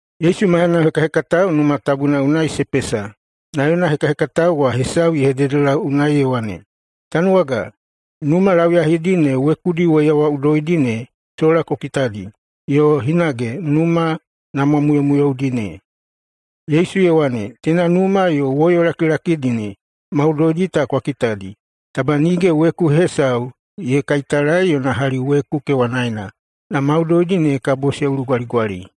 Yesu maiyana hekahekatao Numa Tabuna unai se pesa, na yona hekahekatao wa hesau ye hededelau unai ye wane, “Tanuwaga, numa lauyahidi ne wekudi woiyawaꞌudoidi ne sola ku kitadi yo hinage numa namwamuyomuyoudi ne!” Yesu ye wane, “Teina numa yo woyo lakilakidi maudoidi ta kwa kitadi. Taba nige weku hesau ye kaitalae yona hali weku kewanaena na maudoidi ne kabo se ulugwaligwali.”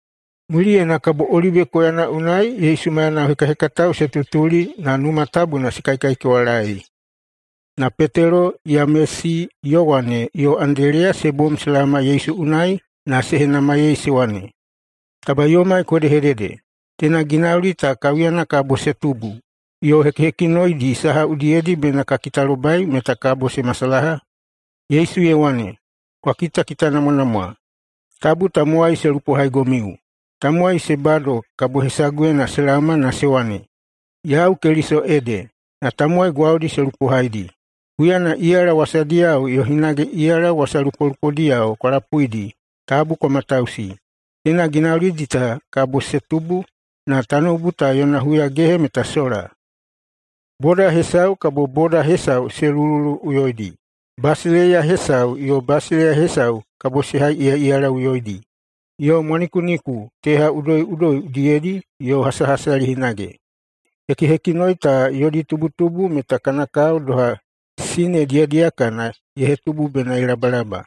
Muliyena kabo Olibe koyana unai Yesu maiyana hekahekatao se tutuli na Numa Tabuna se kaikaikewalaei. Na Petelo, Yamesi, Yowane yo Andeleya se bom se laoma Yesu unai na se henamaiyei se wane, “Taba yomai ku hedehedede, teina ginauli ta kaiuyana kabo se tubu, yo hekihekinoidi saha udiyedi bena ka kitalobai meta kabo se masalaha?” Yesu ye wane, “Kwa kitakitanamwanamwa! Tabu tamowai se lupohaigomiu. Tamowai se bado kabo hesaguyena se laoma na se wane, ‘Yau Keliso ede,’ na tamowai gwaudi se lupohaidi. Huyana iyala wasadiyao yo hinage iyala wasalupolupodiyao kwa lapuidi, tabu kwa matausi. Teina ginaulidi ta kabo se tubu, na tanoubu ta yona huyagehe meta sola. Boda hesau kabo boda hesau se lulululuꞌuyoidi, basileiya hesau yo basileiya hesau kabo se haiꞌiyaꞌiyalaꞌuyoidi. Yo mwanikuniku teha udoiꞌudoi udiyedi yo hasahasali hinage. Hekihekinoi ta yodi tubutubu meta kana kao doha sine diyadiyakana ye hetubu bena ye labalaba.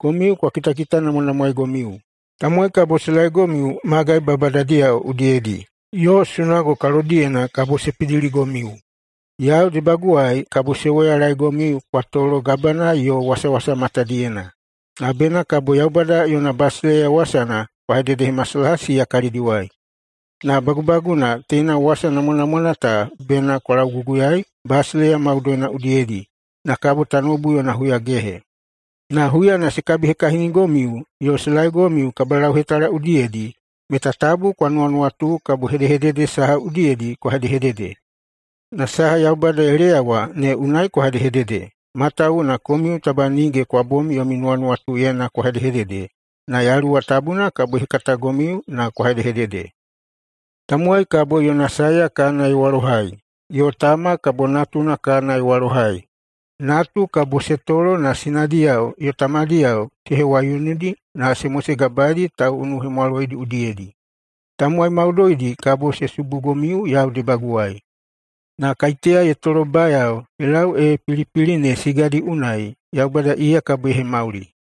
Komiu kwa kitakitanamwanamwaegomiu! Tamowai kabo se laegomiu magai babadadiyao udiyedi, yo sunago kalodiyena kabo se pidiligomiu. Yau debaguwai kabo se woyalaegomiu kwa tolo gabana yo wasawasa matadiyena, na bena kabo [Yaubada yona basileiya wasana] kwa hededehemasalaha siya kalidiwai. Na bagubaguna teina wasa namwanamwana ta bena kwa lauguguyaei basileiya maudoidi udiyedi, na kabo tanoubu yona huyagehe. Na huyana se kabihekahinigomiu yo se laegomiu kabalauhetala udiyedi, meta tabu kwa nuwanuwatu kabo hedehedede saha udiyedi kwa hedehedede, na saha Yaubada ye leyawa ne unai kwa hedehedede, matawuwuna komiu taba nige kwa bom yomi nuwanuwatuyena kwa hedehedede, na Yaluwa Tabuna kabo ye hekatagomiu na kwa hedehedede. Tamowai kabo yona saeya kana ye walohai, yo tama kabo natuna kana ye walohai. Natu kabo se tolo na sinadiyao yo tamadiyao se hewaiunudi na se mosegabaeidi tauꞌunuhemwaloidi udiyedi. Tamowai maudoidi kabo se subugomiu yau debaguwai. Na kaiteya ye tolobayao ye lau ee pilipili ne sigadi unai, Yaubada iya kabo ye hemauli.”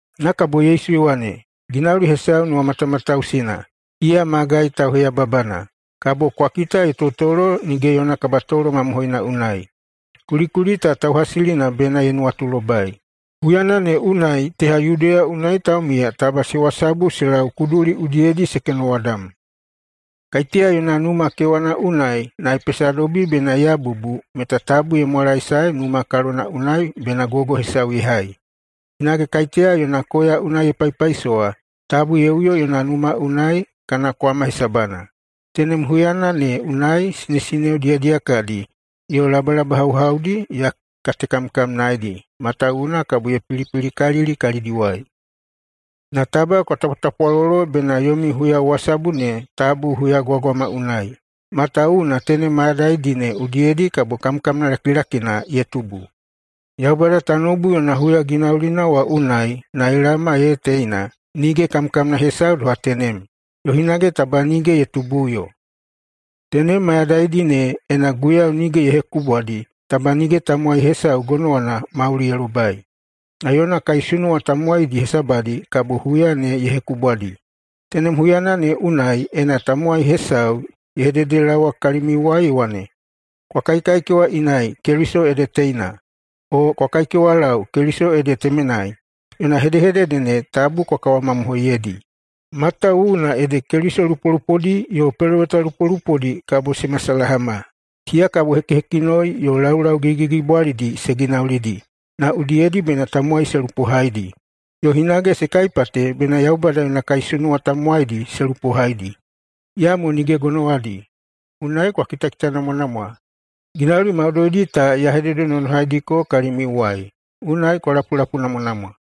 [Na kabo Yesu ye wane,] “Ginauli hesau nuwamatamatausina, iya magai tauheyababana, kabo kwa kita ye totolo nige yona kabatolo mamohoina unai – kulikuli ta tauhasilina bena ye nuwatulobai! Huyana ne unai teha Yudeya unai taumiya taba se wasabu se lau kuduli udiyedi [se kenowadam]. Kaiteya yona numa kewana unai na ye pesadobi bena ye yabubu meta tabu ye mwalaesae numa kalona unai bena gogo hesau ye hai. Hinage kaiteya yona koya unai ye paipaisowa, tabu ye uyo yona numa unai kana kwama hesabana. Tenem huyana ne unai sinesineo diyadiyakadi yo labalabahauhaudi ya katekamkamnaedi matawuwuna kabo ye pilipilikalili kalidiwai! Na taba kwa tapwatapwalolo bena yomi huyawasabu ne tabu huyagwagwama unai. Matawuwuna tenem mayadaidi ne udiyedi kabo kamkamna lakilakina ye tubu. Yaubada tanoubu yona huyaginaulina wa unai na ye laoma ee teina nige kamkamna hesau doha tenem, yo hinage taba nige ye tubuꞌuyo. Tenem mayadaidi ne, ena Guiyau nige ye hekubwadi, taba nige tamowai hesau gonowana mauli ye lobai. Na yona kaisunuwa tamowaidi hesabadi kabo huya ne ye hekubwadi. Tenem huyana ne unai, ena tamowai hesau ye hededelaowa kalimiuwai ye wane, ‘Kwa kaikewa inai! Keliso ede teinai!’, o ‘Kwa kaikewalau, Keliso ede temenai!’, yona hedehedede ne tabu kwa kawakawamamohoiyeidi. Matawuwuna ede Keliso lupolupodi yo peloweta lupolupodi kabo se masalahama. Siya kabo hekihekinoi yo laulau gigigigibwalidi se ginaulidi na udiyedi bena tamowai se lupohaidi, yo hinage se kaipate bena Yaubada yona kaisunuwa tamowaidi se lupohaidi, iyamo nige gonowadi. Unai kwa kitakitanamwanamwa! Ginauli maudoidi ta ya hededenonohaidiko kalimiuwai, unai kwa lapulapuinamwanamwa!”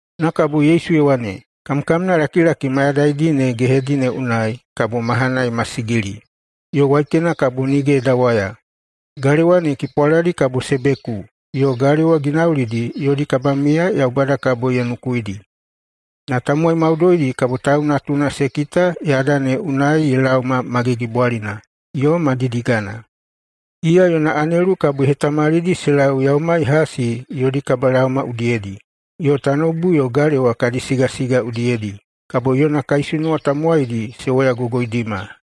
[Na kabo Yesu ye wane,] “Kamkamnalakilaki mayadaidi ne gehedi ne unai ‘kabo mahana ye masigili yo waikena kabo nige ye dawaya, galewa ne kipwaladi kabo se beku, yo galewa ginaulidi yodi kabamiya Yaubada kabo ye nukuidi.’ Na tamowai maudoidi kabo Tau Natuna se kita yada ne unai ye laoma ma gigibwalina yo ma didigana. Iya yona anelu kabo ye hetamalidi se lau yaumai hasi yodi kabalaoma udiyedi, yo tanoubu yo galewa kadi sigasiga udiyedi kabo yona kaisunuwa tamowaidi se woyagogoidima.”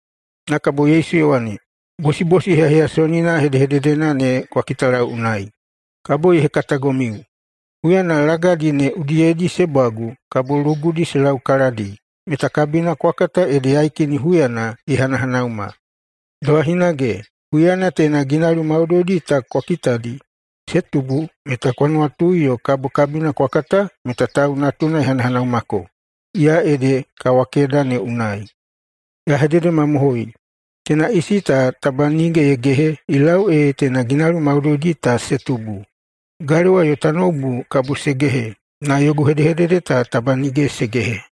[Na kabo Yesu ye wane,] “Bosibosi heyaheyasonina hedehededena ne kwa kitalau unai, kabo ye hekatagomiu. Huyana lagadi ne udiyedi se bwagu, kabo lugudi se laukaladi, meta kabina kwa kata ede yaikini huyana ye hanahanauma. Doha hinage, huyana teina ginauli maudoidi ta kabo kwa kitadi se tubu, meta kwa nuwatui yo kabo kabina kwa kata meta [Tau Natuna] ye hanahanaumako, iya ede kawakeda ne unai. Ya hededemamohoi: Teina isi ta taba nige ye gehe ye lau ee teina ginauli maudoidi ta se tubu. Galewa yo tanoubu kabo se gehe, na yogu hedehedede ta taba nige se gehe.”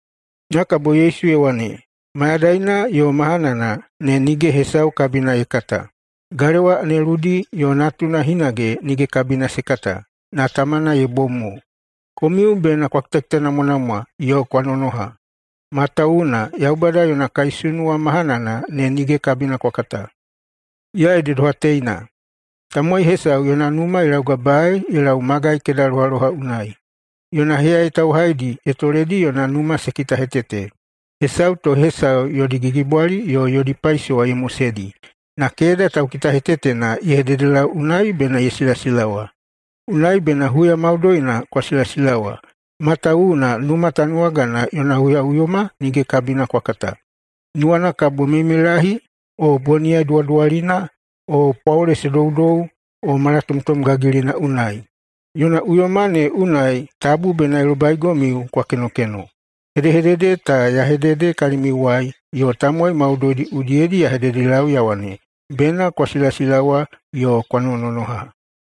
[Na kabo Yesu ye wane,] “Mayadaina yo mahanana ne nige hesau kabina ye kata. Galewa aneludi yo Natuna hinage nige kabina se kata, na Tamana ye bom mo. Komiu bena kwa kitanamwanamwa yo kwa nonononoha, matawuwuna [Yaubada yona kaisunuwa] mahanana ne nige kabina kwa kata. Iya ede doha teina: Tamowai hesau yona numa ye laugabaei ye lau magai kedalohaloha unai. Yona heyayai tauhaidi ye toledi yona numa se kitahetete. Hesau to hesau yodi gigibwali yo yodi paisowa ye moseidi, na keda taukitahetetena ye hededelau unai bena ye silasilawa. Unai bena huya maudoina kwa silasilawa, matawuwuna numa tanuwagana yona huyaꞌuyoma nige kabina kwa kata, nuwana kabo meimeilahi, o boniyai duwaduwalina, o pwaole se doudou, o malatomtom gagilina unai. Yona uyoma ne unai tabu bena ye lobaigomiu kwa kenokeno. Hedehedede ta ya hedede kalimiuwai yo tamowai maudoidi udiyedi ya hededelau ya wane, ‘Bena kwa silasilawa yo kwa nonononoha!’”